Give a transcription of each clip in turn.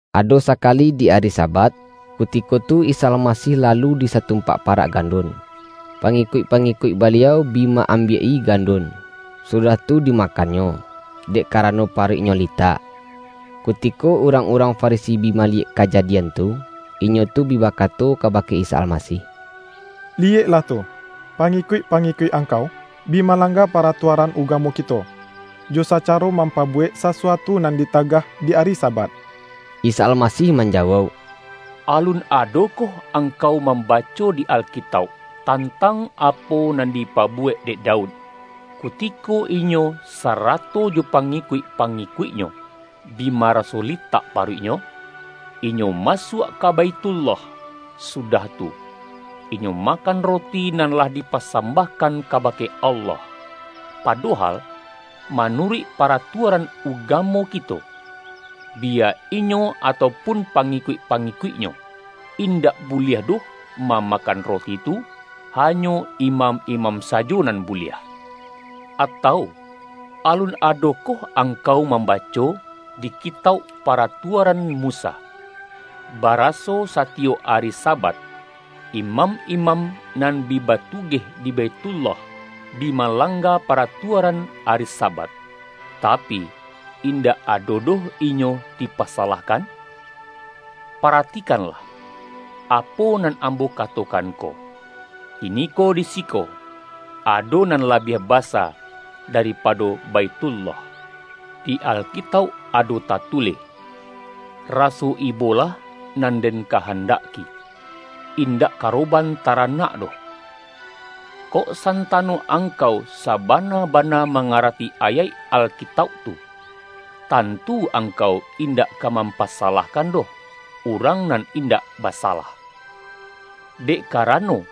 Ado sakali di ari Sabat, kutiko tu Isa Almasih lalu di satum-pak parak gandun, pangikuik-pangi-kuik Baliau bi ma-ambiak-i gandun, sudah tu dimakannyo, dek karano pa-ruiknyo litak. Kutiko urang-urang Farisi bi maliyek kajadian tu, inyo tu bi bakato kabake Isa Almasih,”Liyek-lah tu! Pangikuik-pangikuik Angkau, bi malangga paratuaran ugamo kito, jo sacaro mampabuwek sasuatu nan ditagah di ari Sabat.” Isa Almasih manjawauk,”Alun ado-koh angkau mambaco di Alkitauk, tan-tang apo nan dipabuwek dek Daud, kutiko inyo sarato jo pangikuik-pangi-kuiknyo, bi maraso litak paruiknyo? Inyo masuak ka Baithullah; sudah tu, inyo makan roti nan lah dipasambah-kan kabake Allah. Padohal, manuruik paratuaran ugamo kito, biya inyo, atau pun pangikuik-pangikuiknyo, indak buliah doh mamakan roti tu hanyo imam-imam sajo nan buliah. Atau, alun adokoh angkau mambaco, di ki-tauk paratuaran Musa, baraso satiyok ari Sabat, imam-imam nan bi batugeh di Baithullah, bi malangga paratuaran ari Sabat, tapi, indak ado doh inyo di-pasalahkan? Paratikanlah apo nan Ambo katokan ko: kiniko di siko, ado nan labiah basa, daripado Baithullah. Di Alkitauk ado tatulih: Raso ibolah nan Den kahandaki, indak karoban taranak doh. Kok santano angkau sabana-bana mangarati ayaik Alkitauk tu, tantu angkau indak ka mampasa-lahkan doh, urang nan indak basalah. Dek karano,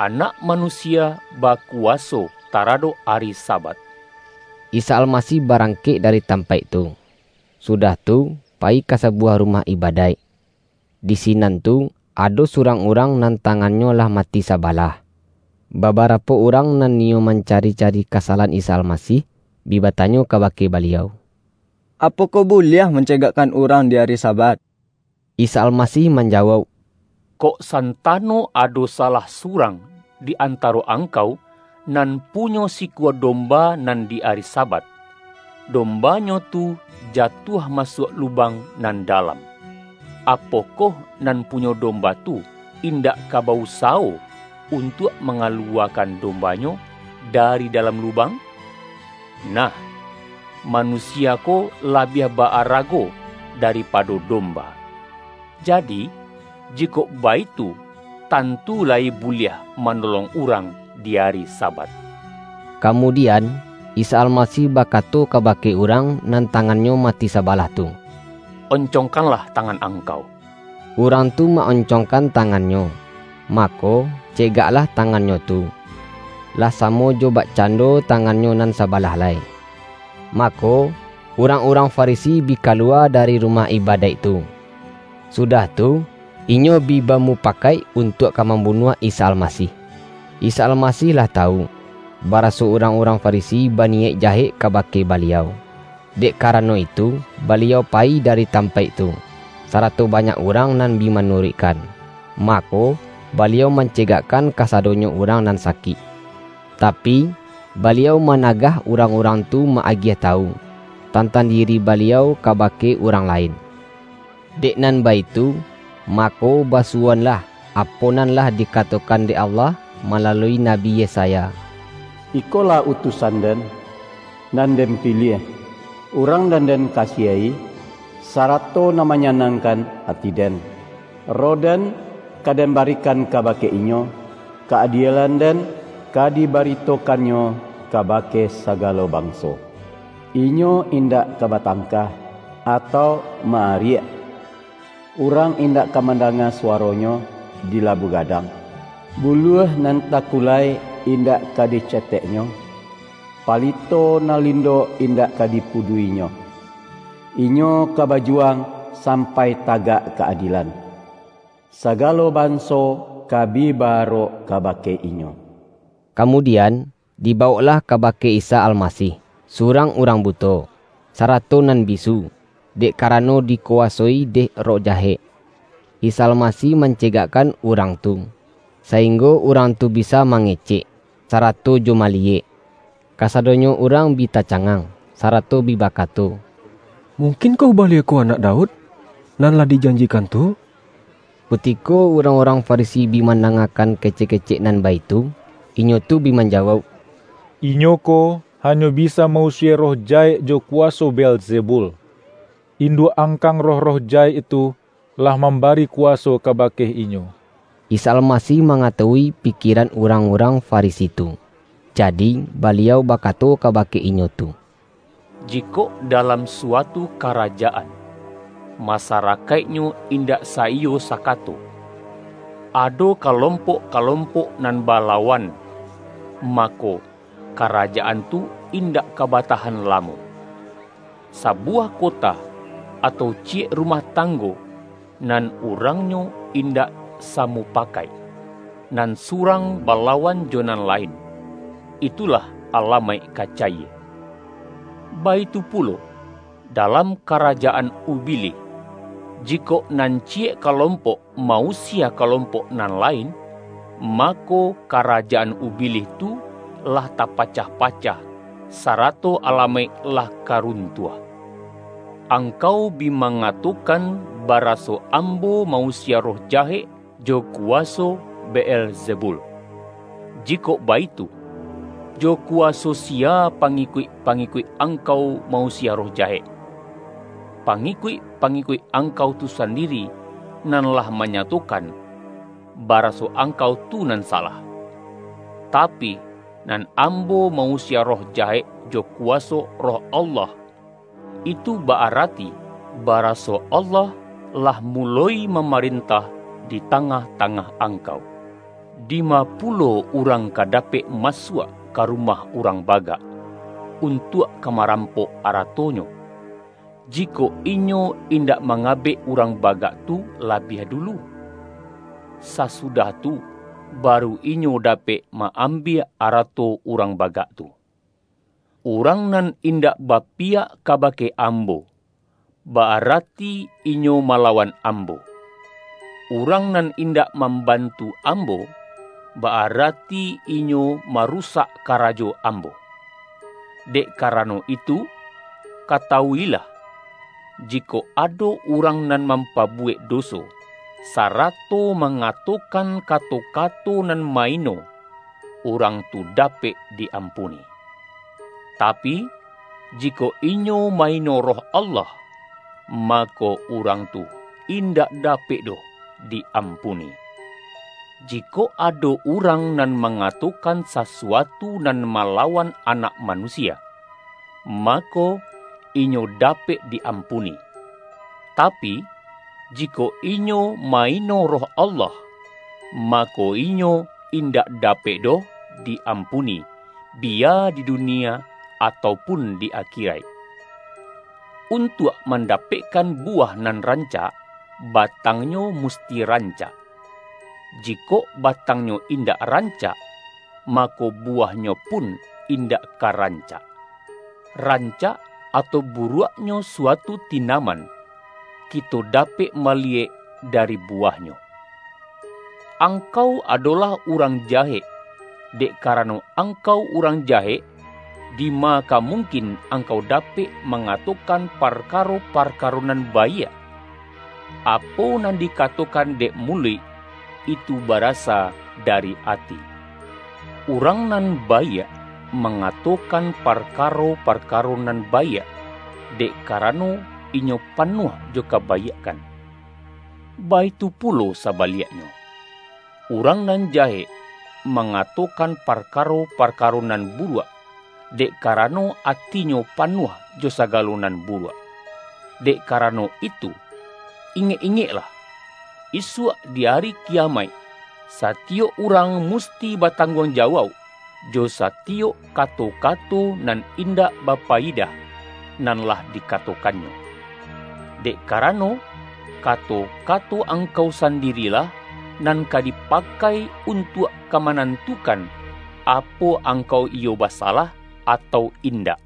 Anak Manusia bakuwa-so taradok ari Sabat.” Isa Almasih barangkek dari tam-paik tu, sudah tu, payi ka sabuwah ru-mah ibadaik. Di sinan tu, ado surang urang nan tangannyo lah mati sabalah. Babarapo urang nan niyo mancari-ca-ri kasalahan Isa Almasih, bi batanyo kabake Baliau,”Apokoh buliah man-cegakkan urang di ari Sabat?” Isa Almasih manjawauk,”Kok san-tano ado salah surang di antaro ang-kau, nan punyo sikua domba, nan di ari Sabat, dombanyo tu jatuah ma-suak lubang nan dalam; apokoh nan punyo domba tu indak ka ba-usawo, untuak mangaluwakan dombanyo da-ri dalam lubang? Nah, manusia ko labiah ba-arago daripado domba! Ja-di, jikok baitu, tantu layi buliah ma-nolong urang di ari Sabat.” Kamudi-an, Isa Almasih bakato kabake urang nan tangannyo mati sabalah tu,”On-congkanlah tangan angkau.” Urang tu ma-oncongkan tangannyo, mako, cegaklah tangannyo tu, lah sa-mo jo bakcando tangannyo nan saba-lah lai. Mako, urang-urang Farisi bi kaluwa dari rumah ibadaik tu, su-dah tu, inyo bi bamupakaik untuak ka mambunuah Isa Almasih. Isa Almasih lah tawu, bara-so urang-urang Farisi baniyaik ja-hek kabake Baliau. Dek karano itu, Baliau payi dari tampaik tu, sarato banyak urang nan bi manuruikkan. Mako, Baliau mancegakkan kasadonyo urang nan sakik. Tapi, Baliau ma-nagah urang-urang tu ma-agiah tawu, tantang diri Baliau kabake urang la-in. Dek nan baitu, mako basuwoan-lah, apo nan lah dikatokan dek Allah malalui Nabi Yesaya, ”Ikolah utusan-Den, nan Den piliah, Urang nan Den kasiahi, sarato nan manyanangkan ati-Den. Roh-Den, ka Den barikan kabake Inyo, ka-adielan-Den, ka dibaritokan-Nyo kabake sagalo banso. Inyo indak ka batangka, atau ma-ariak, urang indak ka mandanga suwaro-Nyo, di labuah gadang. Buluah nan takulai, indak ka diceteh-Nyo, palito nan lindok, indak ka dipudua-i-Nyo. Inyo ka bajuwang, sampai tagak ka-adielan; sagalo banso, ka bi ba-arok kabake Inyo.” Kamudian, dibawoklah kabake Isa Almasih, surang urang buto, sara-to nan bisu, dek karano dikuwasoi dek roh jahek. Isa Almasih mancegakkan urang tu, sainggo urang tu bisa ma-ngecek, sarato jo maliyek. Kasado-nyo urang bi tacangang, sarato bi ba-kato,”Mungkin koh Baliau ko Anak Daud, nan lah dijanjikan tu?” Kutiko urang-urang Farisi bi man-dangakan kecek-kecek nan baitu, inyo tu bi manjawauk,”Inyo ko, hanyo bisa ma-usie roh jahek jo kuwaso Beelzebul, induak-angkang roh-roh jahek tu, lah mambari kuwaso kabake Inyo.” Isa Almasih mangatawui pikie-ran urang-urang Farisi tu. Jadi, Ba-liau bakato kabake inyo tu,”Jikok dalam suatu karajaan, masarakaik-nyo indak saiyo sakato, ado kalompok-kalompok nan balawan, mako, karajaan tu indak ka batahan la-mo. Sabuwah kota, atau ciyek ru-mah tanggo, nan urangnyo indak sa-mupakaik, nan surang balawan jo nan lain, itu lah alamaik ka cayie. Baitu pulo, dalam karajaan Ubilih; jikok nan ciyek kalompok ma-usie kalompok nan lain, mako, karajaan Ubilih tu lah tapacah-pacah, sarato alamaik lah ka runtuah. Angkau bi mangatokan, baraso Ambo ma-usie roh jahek jo kuwaso Beelzebul. Jikok baitu, jo kuwaso siya pangi-kuik-pangikuik angkau ma-usie roh jahek. Pangikuik-pangikuik angkau tu sandiri, nan lah manyatokan, ba-raso angkau tu nan salah! Tapi, nan Ambo ma-usie roh jahek jo ku-waso Roh Allah. Itu ba-arati, bara-so Allah lah muloi mamarentah di tangah-tangah angkau. Dima pulo urang ka dapek ma-suak ka rumah urang bagak, un-tuak ka marampok aratonyo, jikok inyo indak mangabek urang bagak tu labiah dulu? Sasudah tu, baru inyo dapek ma-ambiak arato urang bagak tu. Urang nan indak bapiyak ka-bake Ambo, ba-arati inyo malawan Ambo. Urang nan indak mambantu Ambo, ba-arati inyo marusak karajo Ambo! Dek karano itu, katawu-ilah, jikok ado urang nan mampa-buwek doso, sarato mangatokan ka-to-kato nan ma-ino, urang tu dapek di-ampuni! Tapi, jikok inyo ma-ino Roh Allah, mako, urang tu indak dapek doh di-ampuni! Jikok ado urang nan mangatokan sasuatu nan malawan Anak Manusia, mako, inyo dapek di-ampuni, tapi, jikok inyo ma-ino Roh Allah, mako, inyo in-dak dapek doh di-ampuni, biya di dunia atau pun di akiraik!” ”Untuak mandapekkan buwah nan rancak, batangnyo musti rancak. Jikok batangnyo indak rancak, mako, buwahnyo pun indak ka rancak. Ran-cak, atau buruaknyo suatu tinaman, kito dapek maliyek dari buwahnyo. Angkau adolah urang jahek, dek karano angkau urang jahek, dima ka mungkin angkau dapek mangatokan parkaro-parkaro nan baiak? Apo nan dikatokan dek muluik, itu barasa da-ri ati! Urang nan baiak mangato-kan parkaro-parkaro nan baiak, dek karano inyo panuah jo kabaiakkan. Baitu pulo sabaliaknyo, urang nan ja-hek mangatokan parkaro-parkaro nan buruak, dek karano atinyo panuah jo sagalo nan buruak. Dek karano itu, ingek-ingeklah: isuak di Ari Kiyamaik, satiyok urang musti batangguangjawauk, jo satiyok kato-kato nan indak bapayidah, nan lah dikatokannyo. Dek karano, ka-to-kato angkau sandirilah nan ka dipa-kai, untuak ka manantukan, apo ang-kau iyo basalah atau indak.”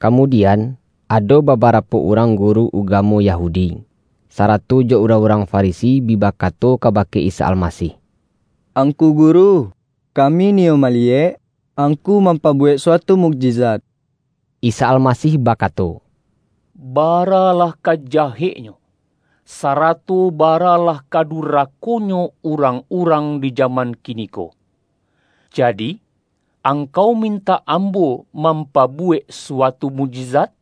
Kamudian, ado babarapo urang guru ugamo Yahudi, sarato jo urang-urang Farisi bi bakato kabake Isa Almasih,”Angku Guru, kami niyo ma-liyek Angku mampabuwek suatu muk-jizat.” Isa Almasih bakato,”Baralah ka jaheknyo, sarato baralah ka durako-nyo urang-urang di jaman kiniko! Ja-di, angkau mintak Ambo mampabu-wek suatu mukjizat?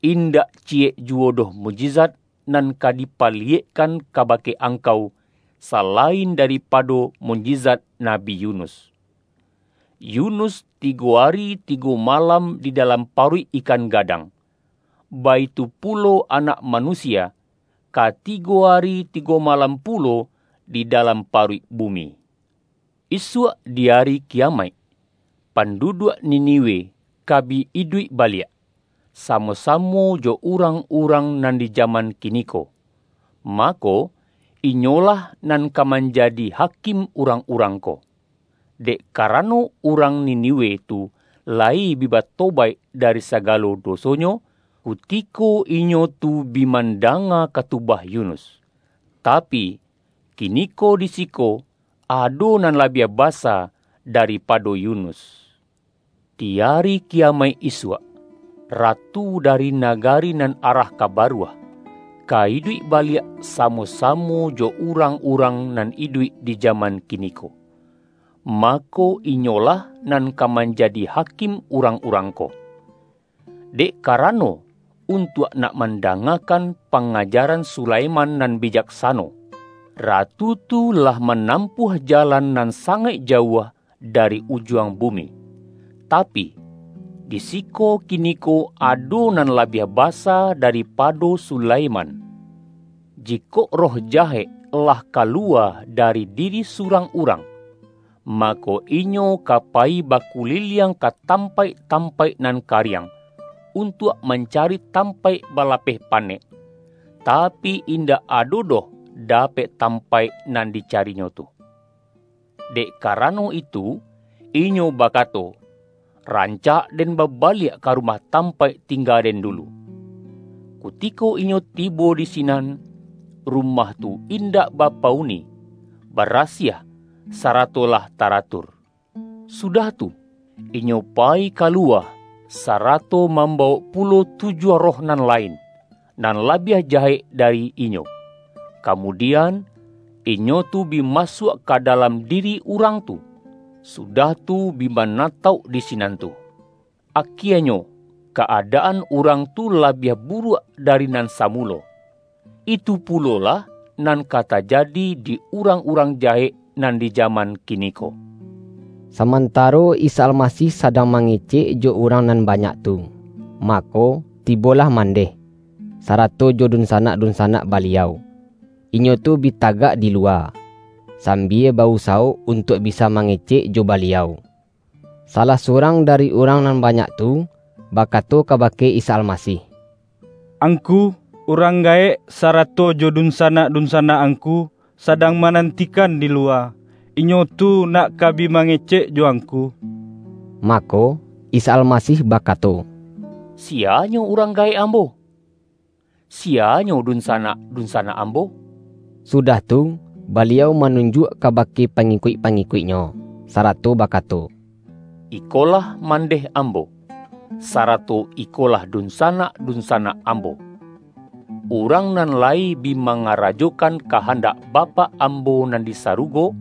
Indak ciyek juwo doh mukjizat nan ka dipaliyekkan ka-bake angkau, salain daripado mukjizat Nabi Yunus. Yunus, tigo ari tigo malam di dalam paruik ikan gadang. Baitu pulo Anak Manusia, ka tigo ari tigo malam pulo di dalam paruik bu-mi. Isuak di Ari Kiyamaik, pandu-duak Niniwe ka bi iduik baliak, samo-samo jo urang-urang nan di jaman kiniko, mako, inyolah nan ka manja-di hakim urang-urang ko. Dek kara-no, urang Niniwe tu layi bi batobaik dari sagalo dosonyo, kutiko inyo tu bi mandanga katubah Yunus. Tapi, kiniko di siko ado nan labiah basa daripado Yunus! Di Ari Kiyamaik isuak, ratu dari nagari nan arah ka Baruah, ka iduik baliak samo-samo jo urang-urang nan iduik di jaman kiniko, mako, inyolah nan ka manja-di hakim urang-urang ko. Dek kara-no, untuak nak mandangakan panga-jaran Sulaiman nan bijaksano, ratu tu lah manampuah jalan nan sangaik ja-uah dari ujuang bumi. Tapi, di siko kiniko ado nan labiah basa daripado Sulaiman!” ”Jikok roh jahek lah kaluwa da-ri diri surang urang, mako, inyo ka payi bakuliliang ka tampaik-tampaik nan kariang, untuak mancari tam-paik balapeh panek, tapi, indak ado doh dapek tampaik nan dicarinyo tu. Dek karano itu, inyo bakato, ’Ran-cak den babaliak ka rumah tampaik tingga den dulu.’ Kutiko inyo tibo di sinan, rumah tu indak bapa-uni, ba-rasiah, sarato lah taratur. Sudah tu, inyo payi kaluwa, sarato mambawok pulo tujuah roh nan lain, nan labiah jahek dari inyo. Kamudian, inyo tu bi masuak ka dalam diri urang tu, sudah tu, bi manatauk di sinan tu. Akienyo ka-adaan urang tu labiah buruak, dari nan samulo. Itu pulo-lah nan ka tajadi di urang-urang ja-hek nan di jaman kiniko.” Samantaro Isa Almasih sadang ma-ngecek jo urang nan banyak tu, mako, tibolah mandeh, sarato jo dunsanak-dunsanak Baliau. Inyo tu bi tagak di luwa, sambia ba-usawo untuak bisa mangecek jo Baliau. Salah surang dari urang nan banyak tu, bakato ka-bake Isa Almasih,”Angku, urang gaek, sarato jo dunsanak-dunsanak Angku, sadang manantikan di luwa. Inyo tu nak ka bi mangecek jo Angku.” Mako, Isa Almasih bakato,”Siya-nyo urang gaek Ambo? Siyanyo dun-sanak-dunsanak Ambo?” Sudah tu, Baliau manunjuak kabake pangikuik-pangikuik-Nyo, sarato bakato,”Ikolah mandeh Ambo, sarato ikolah dunsa-nak-dunsanak Ambo. Urang nan la-yi bi mangarajokan kahandak Bapak Ambo nan di sarugo,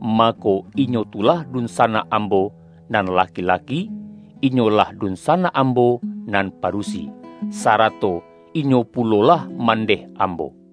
mako, inyo tu lah dunsanak Ambo nan laki-laki, inyo-lah dunsanak Ambo nan padusi, sara-to inyo pulolah mandeh Ambo.”